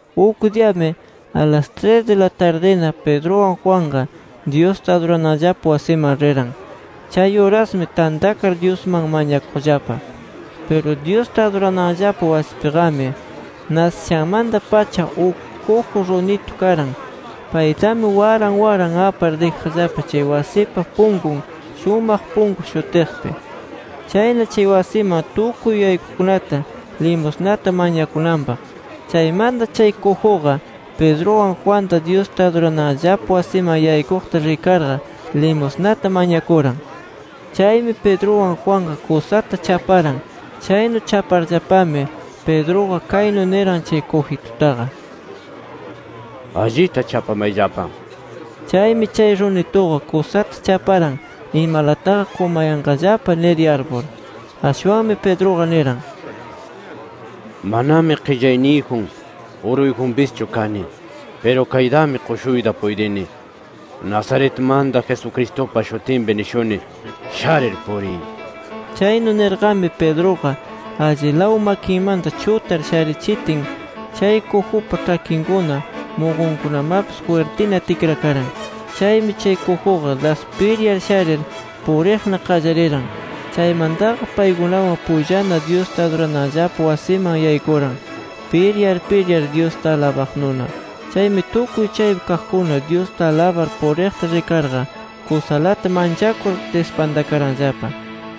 Uk diyami, alas tris di la tardina, Pedruwan Juanqa Dyusta adurananllapa wasiman riran. Chay urasmi tantakar Dyusman mañakuqllapa. Piru Dyusta adurananllapa wasipiqami, nasishanmanta-pacha uk kuju runitu karan. Paytami waran waran apar dijaqllapa chay wasipa punkun “Shumaq Punku” shutiqpi. Chayna chay wasiman tukuy yaykuqkunata limusnata mañakunanpaq. Chaymanta chay kujuqa, Pedruwan Juanta Dyusta adurananllapa wasiman yaykuqta rikarqa, limusnata mañakuran. Chaymi Pedruwan Juanqa kusata chaparan. Chaynu chaparllapami, Pedruqa kaynu niran chay kujitutaqa: —Allita chapamayllapa nir. Chaymi chay runituqa kusata chaparan, imalataqa qumayanqallapa nir yarpur. Ashwanmi, Pedruqa niran: —Manami qillayniyjun, uruyjunpischu kani. Piru kaytami qushuyta puytini, Nazaretmanta Jesucristupa shutinpi nishuni: Sharir puriy nir. Chaynu nirqami Pedruqa allilaw makinmanta chutar sharichitin, chay kujupa ĉhakinkuna, muqunkunamapis jwirtina tikrakaran. Chaymi, chay kujuqa das piryar sharir puriqna qallariran. Chaymantaqa paykunawan pullana, Dyusta adurananllapa wasiman yaykuran, piryar piryar Dyusta alabaqnuna. Chaymi tukuy chaypi kaqkuna, Dyusta alabar puriqta rikarqa, kusalata manchakur dispantakaranllapa.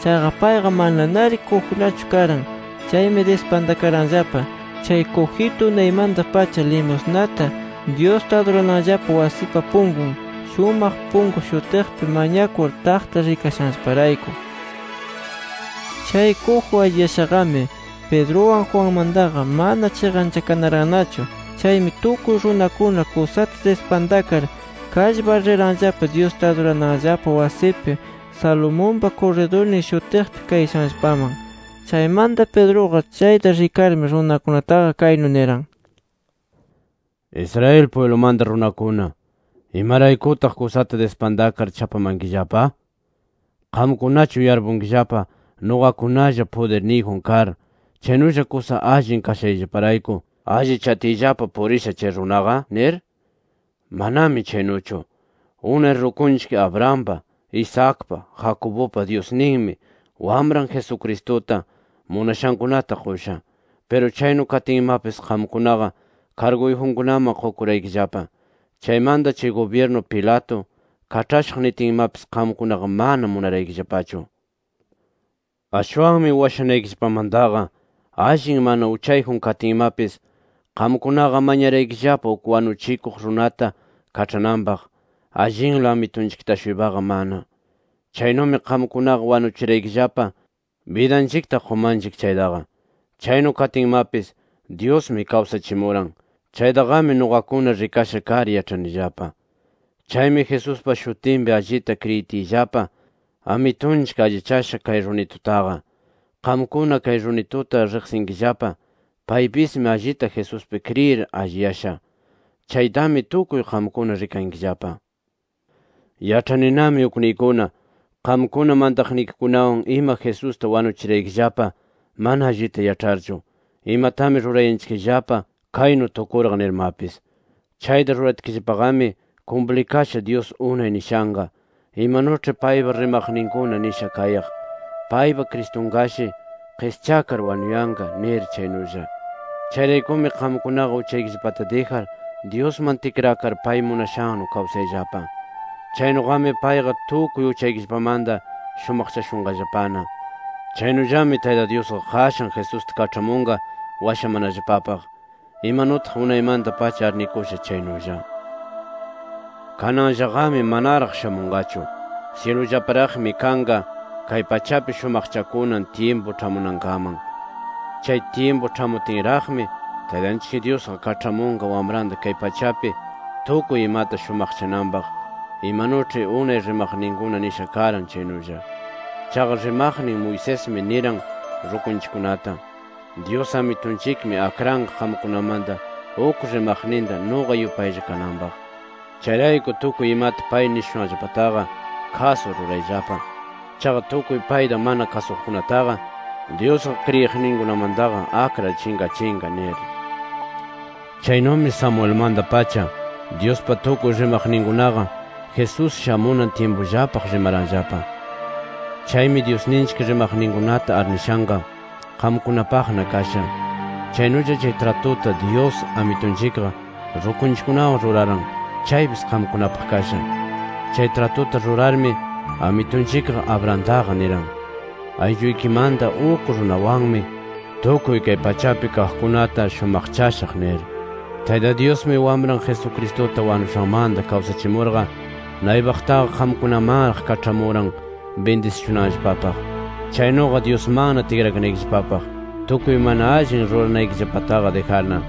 Chaqa payqa mananari kujunachu karan. Chaymi dispantakaranllapa, chay kujitu unaymanta-pacha limusnata, Dyusta adurananllapa wasipa punkun “Shumaq Punku” shutiqpi, mañakur taqta rikashanllaparayku. Chay kuju alliyashaqami, Pedruwan Juanmantaqa mana chiqanchakarannachu. Chaymi tukuy runakuna kusata dispantakar kallpar riranllapa, Dyusta adurananllapa wasipi, “Salomonpa Kurridurnin” shutiqpi kayashanllapaman. Chaymanta, Pedruqa chayta rikarmi, runakunataqa kaynu niran: “Israel pwiblumanta runakuna, ¿imaraykutaq kusata dispantakar, chapamankillapa? ¿Qamkunachu yarpunkillapa, nuqakunalla pudirniyjun kar, chaynulla kusa allin kashayllaparayku allichatiyllapa purisha chay runaqa? nir. ¡Manami chaynuchu! Unay rukunchik Abrahampa, Isaacpa, Jacobupa Dyusninmi, Wamran Jesucristuta, munashankunata qusha. Piru chaynu katinmapis qamkunaqa karguyjunkunaman qukuraykillapa. Chaymanta chay gubyirnu Pilato kaĉhashaq nitinmapis, qamkunaqa mana munaraykillapachu. Ashwanmi washanaykillapamantaqa, allin mana uchayjun katinmapis, qamkunaqa mañaraykillapa uk wanuchikuq runata kaĉhananpaq, allinla Amitunchikta-shuypaqa mana. Chaynumi qamkunaqa wanuchiraykillapa bidanchikta qumanchik chaytaqa. Chaynu katinmapis, Dyusmi kawsachimuran. Chaytaqami nuqakuna rikasha kar, yaĉhanillapa. Chaymi, Jesuspa shutinpi allita kriyitiyllapa, Amitunchik allichasha kay runitutaqa. Qamkuna kay runituta riqsinkillapa, paypismi allita Jesuspi kriyir alliyasha. Chaytami tukuy qamkuna rikankillapa. “Yaĉhaninami ukniykuna, qamkuna mantaqnikikunawan ima Jesusta wanuchiraykillapa mana allita yaĉharchu, imatami rurayanchikllapa kaynu tukurqa nirmapis. Chayta ruratkillapaqami kumplikasha Dyus unay nishanqa, imanuĉhi paypa rimaqninkuna nisha kayaq, ‘Paypa Cristunqashi qischakar wanuyanqa’ nir, chaynulla. Chayraykumi qamkunaqa uchaykillapata dijar, Dyusman tikrakar pay munashannu kawsayllapa. Chaynuqami payqa, tukuy uchaykillapamanta shumaqchashunqallapana. Chaynullami Tayta Dyusqa qashan Jesusta kaĉhamunqa, washamanallapapaq. Imanutaq unaymanta-pacha arnikusha chaynulla. Kananllaqami manaraq shamunqachu. Syilullapiraqmi kanqa, kay pachapi shumaqchakunan tyimpu ĉhamunankaman. Chay tyimpu ĉhamutinraqmi, Taytanchik Dyusqa kaĉhamunqa Wamranta kay pachapi tukuy imata shumaqchananpaq, imanuĉhi unay rimaqninkuna nisha karan chaynulla. Chaqa rimaqnin Moisesmi niran rukunchikkunata: ‘Dyus Amitunchikmi akranqa qamkunamanta uk rimaqninta nuqa yupaylla kananpaq. Chayrayku tukuy imata pay nishushanllapataqa, kasur rurayllapa. Chaqa tukuy payta mana kasuqkunataqa, Dyusqa kriyiqninkunamantaqa akrar chinqachinqa’ nir. “Chaynumi Samuelmanta-pacha, Dyuspa tukuy rimaqninkunaqa, Jesús shamunan tyimpullapaq rimaranllapa. Chaymi Dyusninchik rimaqninkunata arnishanqa, qamkunapaqna kasha. Chaynulla, chay tratuta Dyus Amitunchikqa rukunchikkunawan ruraran, chaypis qamkunapaq kasha. Chay tratuta rurarmi Amitunchikqa, Abrahamtaqa niran: ‘Aylluykimanta uk runawanmi tukuy kay pachapi kaqkunata shumaqchashaq’ nir. Tayta Dyusmi, Wamran Jesucristuta wanushanmanta kawsachimurqa, naypaqtaqa qamkunamanraq kaĉhamuran bindisishunanllapapaq. Chaynuqa Dyusmanna tikrakanaykillapapaq, tukuy mana allin ruranaykillapataqa dijarna”.